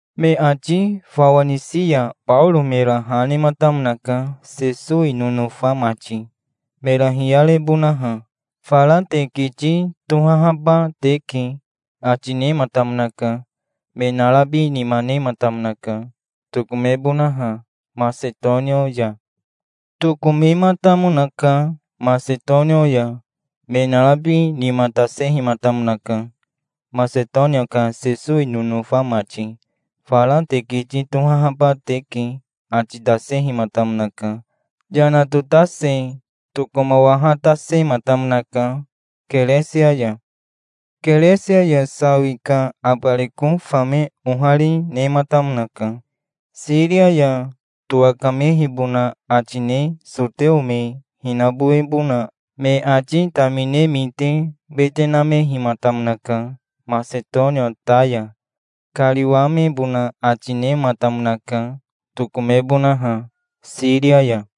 Me ati fawa nisi ya Baoro mera ha nematamonaka, Sesowi nonofa mati, mera hiyarebonaha. "Fara te kiti tohahaba teke", ati nematamonaka. Me narabi nima nematamonaka, tokomebonaha Masetonia ya. Tokomematamonaka Masetonia ya. Me narabi nima tasehimatamonaka, Masetonia ka Sesowi nonofa mati. "Fara te kiti tohahaba teke", ati tasehimatamonaka. Yana totase tokomawahatasematamonaka Keresia ya. Keresia ya sawi ka abariko fame ohari, nematamonaka. Siria ya towakamehibona ati ne soteo me hinabowebona me ati tamine mite wete namehimatamonaka. Masetonia ta ya kariwamebona ati nematamonaka, tokomebonaha Siria ya.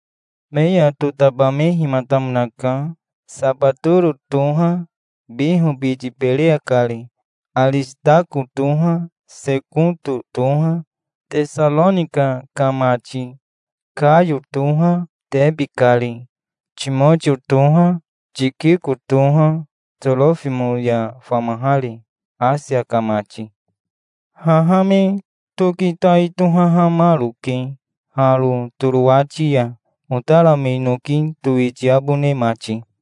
Me ya totabamehimatamonaka. Sabatoro toha, Biho biti, Bereya kari. Arisitako toha, Sekoto toha, Tesaronika ka mati. Kayo toha, Tebi kari. Timotio toha, Tikiko toha, Torofimo ya famahari, Asia ka mati. Haha me toki tai tohahamaroke haro Torowati ya, otara me noki towitiabone mati.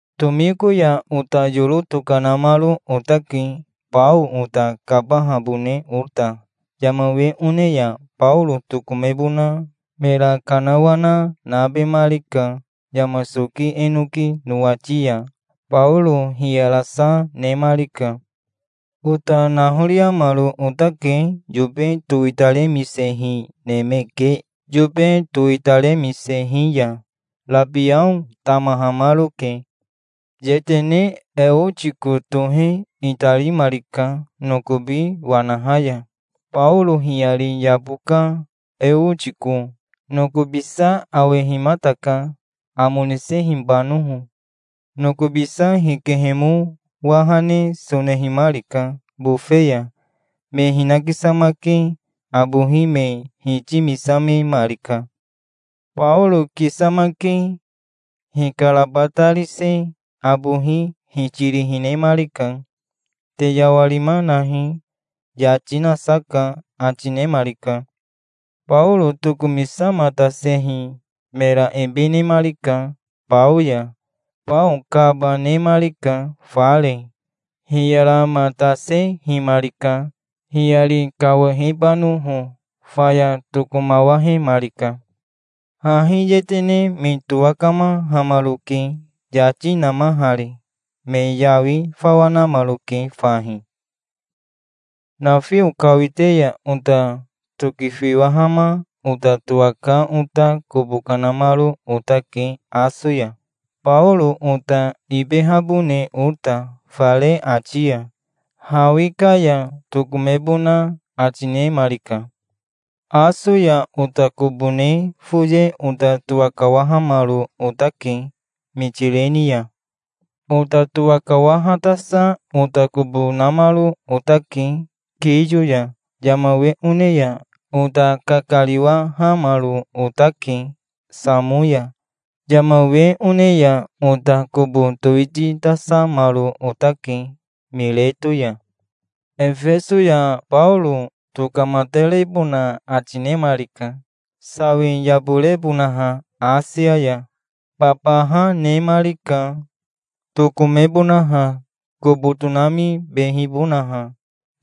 Tomiko ya ota yoro tokanamaro otake, bao ota kabahabone ota. Yama we one ya Baoro tokomebona mera kanawana nabemarika. Yama soki enoki nowati ya Baoro hiyarasa nemarika. Ota nahoriamaro otake yobe towitaremisehi neme ke yobe towitaremisehi ya. Rabiao tamahamaroke. Yetene Eotiko tohe itarimarika nokobi wanaha ya. Baoro hiyari yabo ka Eotiko nokobisa awehimataka, amo nisehibanoho. Nokobisa hikehemo waha ne sonehimarika bofe ya. Me hinakisamake abohi me hitimisamemarika. Baoro kisamake hikarabatarise abohi hitiri hinemarika. "Te yawarima nahi. Yati nasa ka", ati nemarika. Baoro tokomisamatasehi mera ebe nemarika bao ya. Bao kaba nemarika fare. Hiyaramatasehimarika, hiyari kawahebanoho. Faya tokomawahemarika. Hahi yetene me towakamahamaroke yati namahari. Me yawi fawa namaroke fahi. Nafio kawite ya ota tokifiwahama ota towaka ota kobo kanamaro otake Aso ya, Baoro ota ibehabone ota fare ati ya. Hawi ka ya tokomebona ati nemarika. Aso ya ota kobo ne foye ota towakawahamaro otake Mitireni ya. Ota towakawahatasa ota kobo namaro otake Kiyo ya. Yama we one ya ota kakariwahamaro otake Samo ya. Yama we one ya ota kobo towititasamaro otake Mireto ya. Efeso ya Baoro tokamatarebona ati nemarika, sawi yaborebonaha Asia ya. Babaha nemarika, tokomebonaha, kobo tonamibehibonaha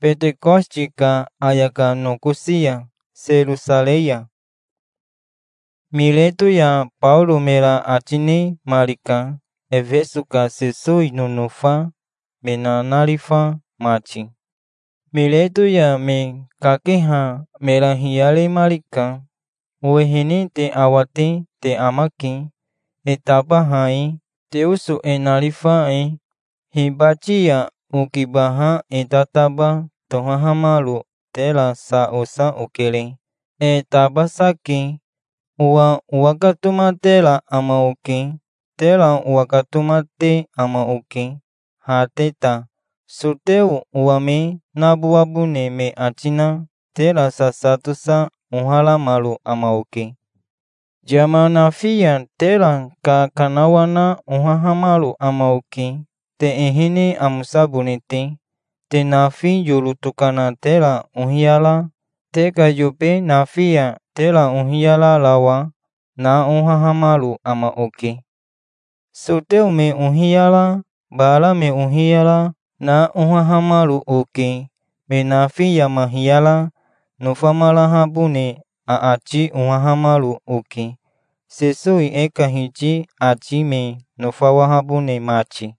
Betekositi ka ayaka nokosi ya Serosarei ya. Mireto ya Baoro mera ati nemarika Efeso ka Sesowi nonofa me nanarifa mati. Mireto ya me kakeha mera hiyaremarika. "Owehene te awate te amake, e tabaha e, Teoso e narifa e. Hibati ya okibaha e tataba tohahamaro tera sa osa okere. E tabasa ke. Owa owakatomatera ama oke. Tera owakatomate ama oke, ha te ta. Soteo owa me nabowabone me ati na tera sasa tosa oharamaro ama oke. Yama nafi ya tera kakanawana ohahamaro ama oke, te ehene amosabone te. Te nafi yoro tokana tera ohiyara, te ka yobe nafi ya tera ohiyararawa, na ohahamaro ama oke. Soteo me ohiyara, bara me ohiyara, na ohahamaro oke. Me nafi yama hiyara nofamarahabone aati ohahamaro oke, Sesowi e ka Hiti ati me nofawahabone mati.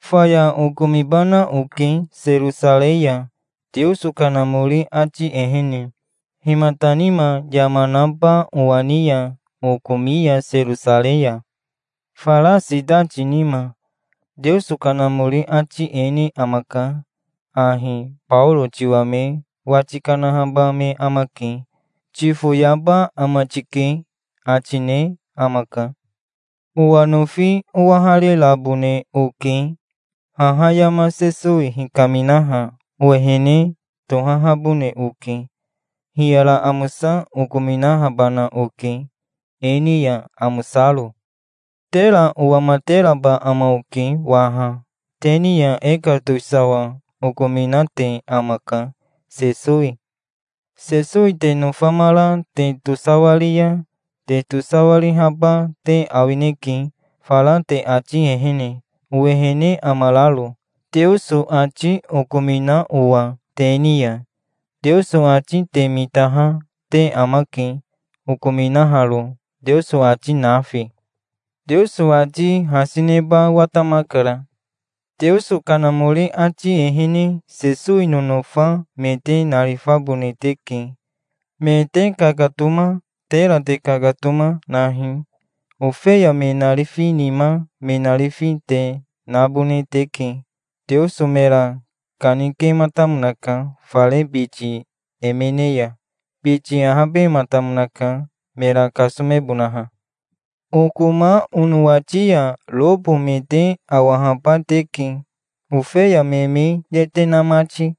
Faya okomibana oke Serosarei ya, Teoso Kanamori ati ehene. Himata nima yama naba owa ni ya okomi ya Serosarei ya? Fara sitati nima Teoso Kanamori ati e ne amaka ahi: 'Baoro tiwa me wati kanahaba me amake. Tifoyaba ama tike', ati ne amaka. Owa nofi owaharirabone oke. Haha yama Sesowi hikaminaha owehene tohahabone oke. Hiyara amosa okominahabana oke, e ni ya amosaro". "Tera owamateraba ama oke waha. Te ni ya e ka towisawa okominate amaka, Sesowi. Sesowi te nofamara te tosawari ya te tosawarihaba te awineke, fara te ati ehene, owehene amararo, Teoso ati okomina owa te ni ya. Teoso ati te mitaha te amake, okominaharo, Teoso ati nafi. Teoso ati hasi neba watamakara. Teoso Kanamori ati ehene Sesowi nonofa me te narifabone teke. Me te kakatoma, tera te kakatoma, nahi. Ofeya me narifi nima me narifi te nabone teke. Teoso mera kanikematamonaka fare biti emene ya. Biti ahabematamonaka, mera kasomebonaha. Okoma onowati ya robo me te awahaba teke, ofeya me me yete na mati.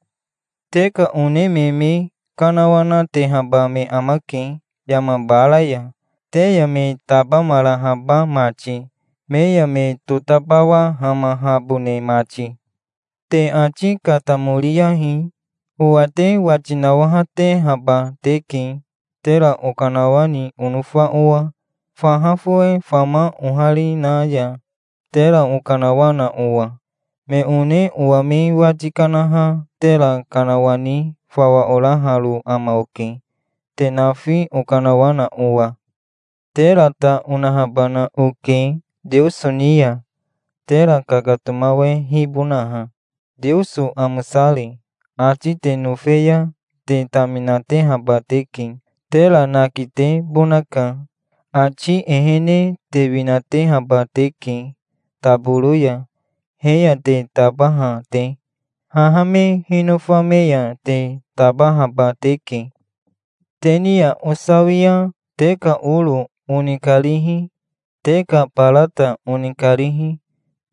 Te ka one me me kanawanatehaba me amake yama bara ya, te ya me tabamarahaba mati, me ya me totabawahamahabone mati. Te ati katamoriyahi. Owa te wati nawahatehaba teke, tera okanawani onofa owa, faha fowe fama ohari na ya tera okanawana owa. Me one owa me wati kanaha tera kanawani fawa oraharo ama oke, te nafi okanawana owa. Tera ta onahabana oke Teoso ni ya, tera kakatomawehibonaha, Teoso amosari. Ati te nofe ya te taminatehaba teke. Tera nakitebonaka. Ati ehene te winatehaba teke taboro ya, he ya te tabaha te. Haha me hinofa me ya te tabahaba teke". "Te ni ya osawia te ka oro onikarihi, te ka barata onikarihi,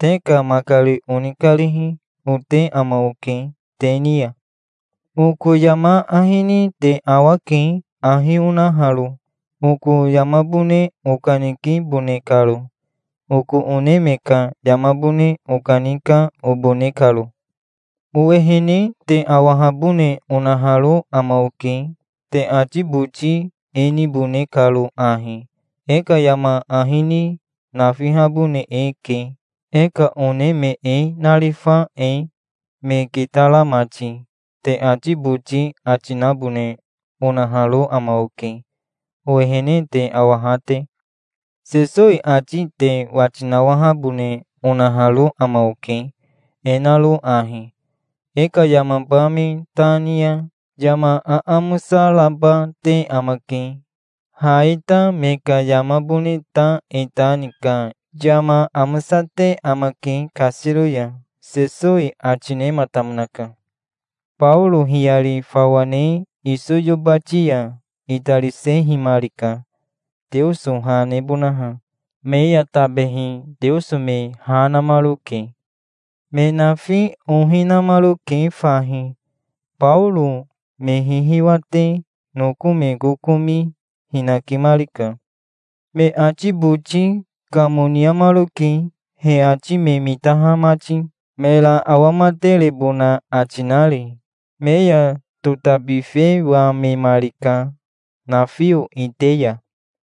te ka makari onikarihi, ote ama oke te ni ya. Oko yama ahi ni te awake, ahi onaharo, oko yamabone okanikibone karo, oko one me ka yamabone okanika, obone karo. Owehene te awahabone onaharo ama oke, te ati boti e nibone karo ahi: 'E ka yama ahi ni nafihabone eke, e ka one me e narifa e, me kitara mati', te ati boti ati nabone onaharo ama oke, owehene te awaha te. Sesowi ati te wati nawahabone onaharo ama oke, e naro ahi: 'E ka yamaba me ta ni ya yama aamosa raba te amake. Ha e ta me ka yamabone ta e ta ni ka yama amosate amake kasiro ya', Sesowi ati nematamonaka". Baoro hiyari fawa ne iso yobati ya itarisehimarika, Teoso ha nebonaha. Me ya tabehi Teoso me ha namaroke. Me nafi ohi namaroke fahi. Baoro me hihiwate noko me kokomi hinakimarika. Me ati boti kamoniamaroke, he ati me mitaha mati, mera awamaterebona ati nari. Me ya totabifewamemarika, nafio ite ya.